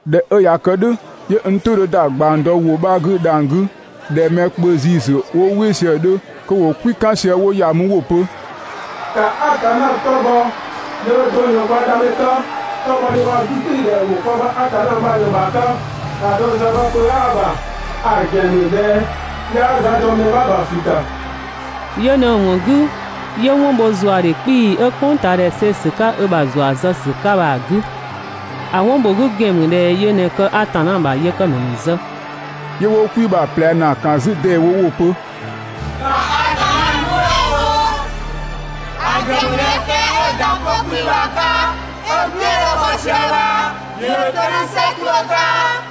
꞊Dhɛ 'ö ꞊ya kë "dhʋ̈, 'yö n "tʋ 'dhö ‑da ꞊gbang dɔ ‑wʋ 'bha 'gü dhang‑ 'gü ꞊dhɛ mɛ kpö ‑ziisü 'wo "wɩ sië‑ 'dhö kö ‑wo "kwi "kan sië 'wo ‑ya mü 'wo‑ pö: «‑Ka Atanna 'tɔ bhɔ, yöö do ꞊në kwa Dhamɛ 'ka, 'tɔbhɔdhe waa‑ 'gügbɩɩdhɛ ‑wo kwa ‑bha Atanna bha ꞊në‑ ‑bha 'ka. ‑A dɔ ‑za bha pö 'aa‑ ‑bha, ‑a ‑gɛn ‑mü ꞊dhɛ 'yaa za dɔ mɛ 'bha ‑bha ꞊flü ‑ta. Yö ꞊në‑ ‑wɔn 'gü 'yö 'wɔn bho ‑zuadhe 'kpii‑ 'ö "kpʋngtaadhɛ see‑ ‑sü 'ka ö ‑bha ‑zua zë ‑sü 'ka bha‑ 'gü. ‑A 'wɔn ‑bho 'gü ‑gɛn ‑mü ꞊dhɛ yö ꞊në kë Atanna ‑bha yëkëmɛ ‑nu ‑zë.» 'Yö 'wo "kwi bha‑ ꞊plɛ ‑naa ‑kan 'zü ‑deewo 'wo‑ pö: «‑Ka Atanna nuɛ" bho! ‑A ‑gɛn ‑mü ꞊dhɛ pɛng 'ö‑ ‑da 'pö 'kpii‑ bha‑ 'ka 'ö‑ "gbiën 'dhö bhɔ sië bha ‑yö ‑dho 'to "dhʋ̈ "sɛ 'tuʋ̈‑ 'ka!»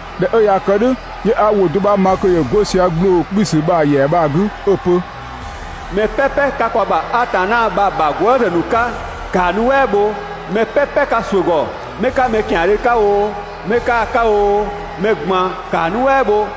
꞊Dhɛ 'ö ꞊ya kë "dhʋ̈, 'yö 'a ‑wʋ do 'bha ma kö ‑yö 'go sië ‑gbloo 'kpiisü bha‑ ‑yɛa bha‑ 'gü 'ö‑ pö: «Mɛ "pɛpɛ 'ka kwa ‑bha Atanna bha‑ ‑bha gwëëzë ‑nu 'ka ‑kaa nuɛ" bho! Mɛ "pɛpɛ 'ka ‑suʋ̈ ‑gɔ, 'mɛ 'ka mɛ ‑tiandhö 'ka oo, mɛ 'kaa‑ 'ka oo, mɛ ꞊gban ‑kaa nuɛ" bho!»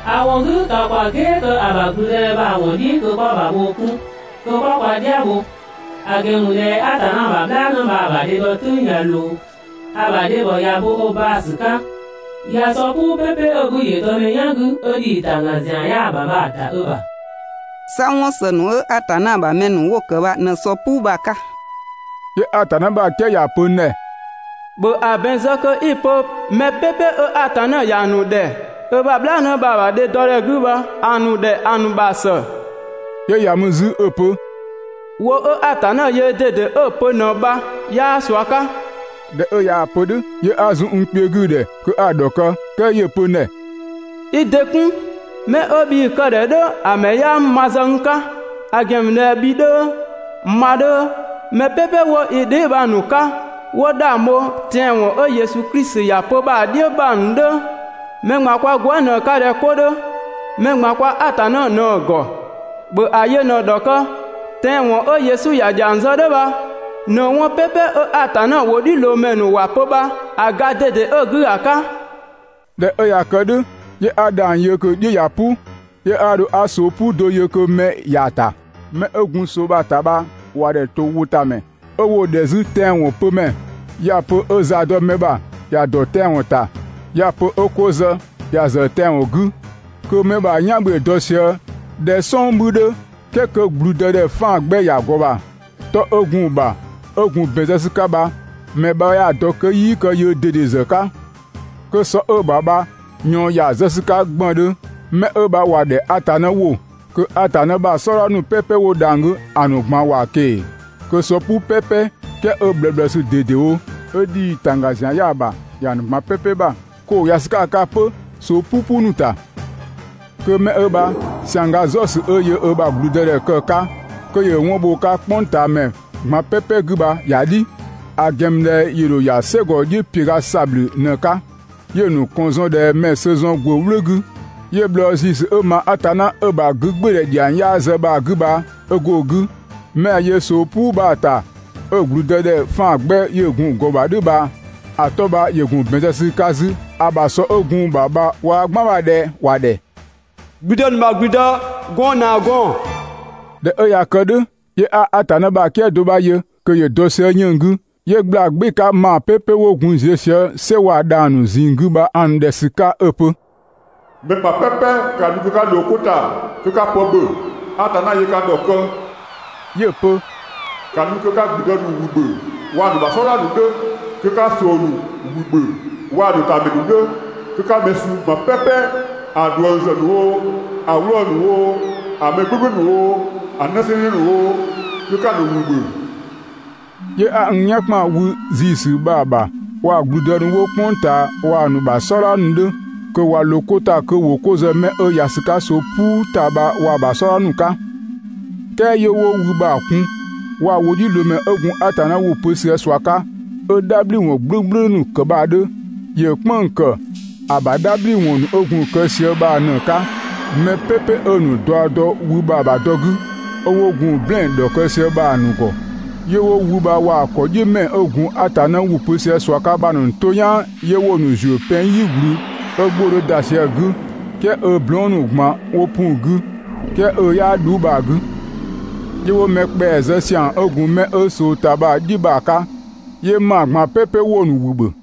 ‑A ‑wɔn 'gü, ‑ka ‑kwa "gɛɛ kë ‑bha ‑gblüdëdhɛ bha‑ ‑wɔn "dhiʋ̈ kö 'kwa‑ ‑bha bhoo 'kun, kö 'kwa kwa dhia" bho. ‑A ‑gɛn ‑mü ꞊dhɛ Atanna ‑bha "bhlaanë bha‑ ‑bha dhe dɔ "tʋ̈ng ꞊ya ꞊loo, ‑a ‑bha dhebhɔ ꞊ya ö bo ö baa‑ ‑sü 'ka. ꞊Ya sɔ "puu "pepe 'bhü ‑yö dɔ mɛ "yan 'gü, 'ö ‑dhii ‑tangga ‑zian 'yaa‑ ‑bha bha‑ ‑da ö ‑bha.» 'Sa 'wɔn ‑së ‑nu 'ö Atanna ‑bha mɛ ‑nu 'wo‑ ‑kë bha ꞊në sɔ "puu bha‑ 'ka. 'Yö Atanna ‑bha "kië ‑ya pö n ‑dhɛ: «‑Bhö ‑a ‑bɛn zë kö 'i‑ pö mɛ "pɛpɛ 'ö Atanna ‑ya ‑nu ‑dhɛ ö ‑bha "bhlaanë bha‑ ‑bha dhe dɔ ‑dhɛ 'gü bha‑ ‑nu ‑dhɛ ‑a ‑nu ‑bha ‑së.» 'Yö ‑ya mü 'zü 'ö‑ pö: «‑Wʋ 'ö Atanna yöö ꞊dede 'ö‑ pö ꞊në bha, 'yaa ꞊sua 'ka.» ꞊Dhɛ 'ö ꞊yaa‑ pö "dhʋ̈, 'yö 'a zun n kpiö 'gü‑ ‑dhɛ kö 'a‑ ‑dhɔkë, "kɛɛ 'yö‑ pö n ‑dhɛ: «I ‑dɩ 'kun! 'Mɛ 'ö bhii‑ kë‑ ‑dhɛ "dhʋ̈ ‑a ‑mɛ 'yaa ‑mü ma ‑zë n 'ka. ‑A ‑gɛn ‑mü ꞊dhɛ bhi 'dhö, ma 'dhö, mɛ "pɛpɛ 'wo i dheebhang ‑nu 'ka 'wo 'dhang bho tɛanwɔn 'ö Yesu Klisi ‑ya pö bha‑ "dhiʋ̈ bha‑ ‑nu 'dhö, mɛ ꞊gban kwa gwëë" ꞊në‑ 'ka ꞊dhɛ 'ko 'dhö. Mɛ ꞊gban kwa Atanna ꞊në ‑gɔ, ‑bhö ‑a yö ꞊në‑ ‑dhɔkë!» Tɛanwɔn 'ö Yesu ‑ya ‑dhiang zë "dhʋ̈ bha ꞊në 'wɔn "pɛpɛ 'ö Atanna ‑wʋdhiʋ̈loomɛ ‑nu ‑wa pö bha‑ ga ꞊dede 'ö‑ 'gü ‑a 'ka. ꞊Dhɛ 'ö ꞊ya kë "dhʋ̈, 'yö 'a dhang‑ yö kö‑ "dhi ꞊ya "pʋ. 'Yö 'a dho 'a ꞊soo "puu do yö kö mɛ ‑ya ‑ta. 'Mɛ 'ö gun ꞊soo bha‑ ‑ta bha ‑wa ‑dhɛ ‑towʋtamɛ, 'ö 'wo‑ ‑dhɛ 'zü tɛanwɔn pömɛ. ꞊Yaa‑ pö 'ö za dɔ mɛ ‑bha ‑ya ‑dɔ tɛanwɔn ‑ta, ꞊yaa‑ pö 'ö 'ko zë, ‑ya ‑zë tɛanwɔn 'gü. Kö 'mɛ 'ö bha‑ "yan 'bhü ‑yö dɔ sië ꞊dhɛ "sɔng 'bhü 'dhö "kɛɛ kö ‑gblüdëdhɛ 'faan‑ 'gbɛ ‑ya ‑gɔ ‑bha. 'Tɔ 'ö gun‑ ‑bha 'ö gun ‑bɛn zë ‑sü 'ka bha mɛ 'bha 'yaa‑ dɔ kö 'yii kë yöö ꞊dede ‑zë 'ka. Kö sɔ 'ö‑ ‑bha bha ꞊yɔɔn ‑ya zë ‑sü 'ka ‑gbëndhö. Mɛ 'ö bha ‑wa ‑dhɛ ‹Atanna ‑wʋ› kö Atanna ‑bha "sɔdha ‑nu "pɛpɛ 'wo dhang‑ 'gü ‑a ‑nu ꞊gban ‑wa ꞊keng‑, kö sɔ "puu "pepe, "kɛɛ 'ö ꞊bhlëësü ꞊dedewo, 'ö ‑dhii ‑tangga ‑zian 'yaa‑ ‑bha ‑ya ‑nu ꞊gban "pɛpɛ ‑bha kö ‑wo ‑ya ‑sü 'ka‑ 'ka 'pö ꞊soo "pupu ‑nu ‑ta. Kö 'mɛ 'ö bha ‑siangga "zɔ ‑sü 'ö yöö ö ‑bha ‑gblüdëdhɛ kë‑ 'ka, kö ‑yö 'wɔn bho‑ 'ka "kpʋngtaamɛ ꞊gban "pɛpɛ 'gü bha ‑ya "dhi. ‑A ‑gɛn ‑mü ꞊dhɛ ‑yö ‑dho ‑ya "sɛgɔ "dhiʋ̈ ‑piöga ‑sabhlü ꞊në‑ 'ka, 'yö‑ ‑nu ‑kɔn zɔn ꞊dhɛ mɛ‑ sö zɔn ‑gwë "wlʋ̈ 'gü, 'yö bhlɔɔ ‑ziisü 'ö ma Atanna 'ö‑ ‑bha 'gügbɩɩdhɛ ‑dhiang 'yaa zë bha‑ 'gü bha 'ö go‑ 'gü. 'Mɛ 'a‑ yö ꞊soo "puu bha‑ ‑ta 'ö ‑gblüdëdhɛ 'faan‑ 'gbɛ ‑yö gun ‑gɔ ‑bha "dhʋ̈ bha 'tɔ 'bha ‑yö ‑gun ‑bɛn zë ‑sü 'ka 'zü ‑a ‑bha sɔ 'ö gun‑ ‑bha bha waa‑ "gban ‑bha ꞊dhɛ ‑wa ‑dhɛ ‹‑Gblüdë ‑nu ‑bha ‑gblüdë, gɔɔn‑ ‑nu ‑bha gɔɔn‑›. ꞊Dhɛ 'ö ꞊ya kë "dhʋ̈, 'yö 'a Atanna ‑bha "kië do 'bha yö kö ‑yö dɔ sië 'yënng‑ 'gü. 'Yö ꞊gbla "gbɩɩ‑ 'ka ‑maa "pɛpɛ 'wo gun ziö sië "sɛ waa‑ dhang‑ ‑a ‑nu ꞊zinng 'gü bha‑ ‑nu ‑dhɛ 'ö‑ pö: «Mɛ ꞊gban "pɛpɛ ka nu kö 'ka ꞊loo 'ko ‑ta kö 'ka pë ‑bhö, Atanna yöö ka ‑dhɔkë!» 'Yö‑ pö: «‑Ka nu kö 'ka ‑gblüdë ‑nu ‑wü ‑bhö, waa‑ "sɔdha ‑gɔmɛ ‑nu waa‑ ‑nu ‑bha "sɔdha ‑nu 'dhö, kö 'ka ꞊soo ‑nu ‑wü ‑bhö waa‑ ‑nu ‑ta ‑mɛ ‑nu 'dhö, kö 'ka mɛ suu ꞊gban "pɛpɛ, ‑a ꞊dhuëng ‑zë ‑nu oo, ‑a 'wlɔɔ‑ ‑nu oo, ‑a mɛ "gblʋ̈gblʋ̈ ‑nu oo, ‑a 'nësɛɛnnë ‑nu oo, kö 'ka‑ ‑nu ‑wü ‑bhö!» 'Yö 'a n "yan ‑kpan wü ‑ziisü bha‑ ‑bha waa‑ ‑gblüdë ‑nu 'wo "kpʋng ꞊taa waa‑ ‑nu ‑bha "sɔdha ‑nu 'dhö, kö ꞊wa ꞊loo 'ko ‑ta kö ‑wo 'ko zë 'mɛ 'ö ‑ya ‑sü 'ka ꞊soo "puu ‑ta bha waa‑ ‑bha "sɔdha ‑nu ‑nu 'ka. "Kɛɛ 'yö 'wo wü bha‑ kun, waa‑ ‑wʋdhiʋ̈loomɛ 'ö gun Atanna ‑wʋ pö sië ꞊sua 'ka 'ö "dhabhliwɔn "gblʋ̈gblʋ̈ ‑nu kë bha‑ 'dhö. ‑Yö "kpënng‑ ‑kë ‑a ‑bha "dhabhliwɔn ‑nu 'ö gun‑ kë sië bha ꞊në 'ka mɛ "pɛpɛ 'ö‑ ‑nu daɔ dɔ wü bha‑ ‑bha dɔ 'gü, 'ö 'wo gun‑ "blɛɛn‑ ‑dhɔkë sië bha‑ ‑nu ‑gɔ. 'Yö 'wo wü bha waa‑ ‑kɔdhiʋ̈mɛ 'ö gun Atanna ‑wʋ pö sië ꞊sua 'ka bha‑ ‑nu to "yaan 'yö 'wo‑ ‑nu ‑zuö pɛng "yi ꞊gblü 'ö 'gbʋ‑ 'dhö ‑da sië‑ 'gü "kɛɛ 'ö blɔɔn" ‑nu ꞊gban 'wo pu‑ 'gü "kɛɛ 'ö 'yaa "dhuu bha‑ bha‑ 'gü. 'Yö 'wo mɛ ‑kpɛa zë ‑siang 'ö gun 'mɛ 'ö ꞊soo ‑ta bha‑ "dhi bha‑ 'ka, 'yö ‑maa ꞊gban "pɛpɛ 'wo‑ ‑nu ‑wü ‑bhö.